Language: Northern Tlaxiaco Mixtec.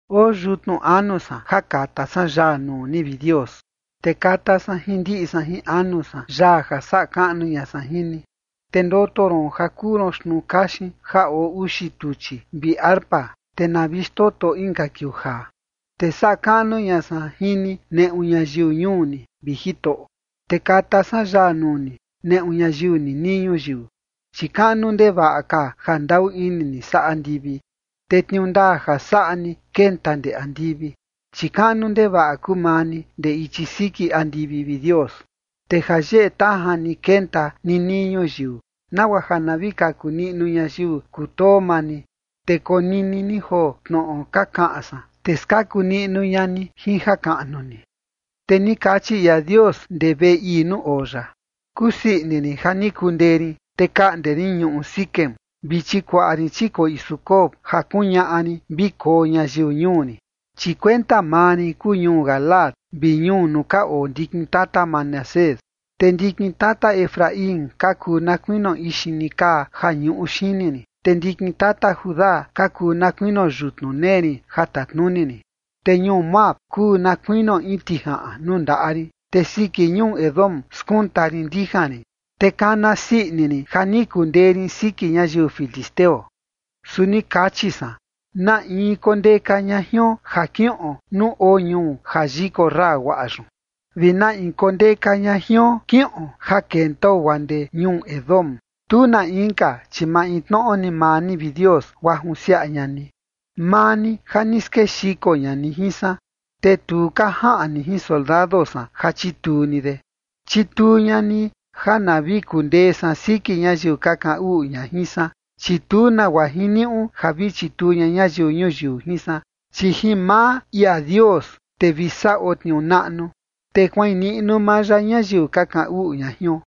Oo yutnu anu san, ja kata san yaa nuu ni, vi Dios, te kata san jin ndiꞌi san jin anu san yaa ja saꞌa kaꞌnu ña san jin ni. Te ndoto ron ja kuu ron xtnuu kaxin ja oo uxi tuchi, vi arpa, te na vi xtoto inka kiuu jaa. Te saꞌa kaꞌnu ña san jin ni neꞌu ñayiu ñuu ni, vi Jitoꞌo, te kata san yaa nuu ni neꞌu ñayiu ninii ñuyiu. Chi kaꞌnu ndevaꞌa ka ja ndaꞌu ini ni saa andivi, te tniuu ndaa ja saꞌa ni kenta ndee andivi. Chi kaꞌnu ndevaꞌa kuu maa ni ndee ichi siki andivi, vi Dios, te ja yeꞌe tajan ni kenta ninii ñuyiu, nagua ja na vi kaku niꞌnu ñayiu kutoo maa ni. Te konini ni joo tnoꞌo ka kaꞌan san, te skaku niꞌnu ña ni jin jakaꞌnu ni. Te ni kachi ia Dios ndee veꞌe ii nuu oo ya: “Kusii ini rin ja ni kundee rin, te kaꞌnde rin ñuꞌu Siquem vi chikuaꞌa rin chikoꞌi Sucot ja kuñaꞌa rin vi koo ñayiu ñuu rin. Chi kuenta maa rin kuu ñuu Galaad vi ñuu nuu ka oo ndikin tata Manasés, te ndikin tata Efraín ka kuu na kuinio ixini kaa ja ñuꞌu xini rin, te ndikin tata Judá ka kuu na kuinio yutnu nee rin ja tatnuni rin. Te ñuu Moab kuu na kuinio in tijaꞌan nuu ndaꞌa rin, te siki ñuu Edom skunta rin ndijan rin, te kana sii ini rin ja ni kundee rin siki ñayiu filisteo.” Su ni kachi san: “¿Na in kondeka ña jion ja kiꞌon nuu oo ñuu ja yikorra guaꞌa yun? ¿Vi na in kondeka ña jion kiꞌon ja kentao guaa ndee ñuu Edom?” Tu na inka, chi maintnoꞌo ni maa ni, vi Dios, guaa junsiaꞌa ña ni, maa ni, ja ni skexiko ña ni jin san, te tu ka jaꞌan ni jin soldado san ja chituu ni de. Chituu ña ni ja na vi kundee san siki ñayiu ka kaꞌan uꞌu ña jin san, chi tu nagua jiniuꞌu ja vi chituu ña ñayiu ñuyiu jin san. Chi jin maa ia Dios, te vi saꞌo tniuu naꞌnu, te kuaꞌin niꞌnu maa ya ñayiu ka kaꞌan uꞌu ña jion.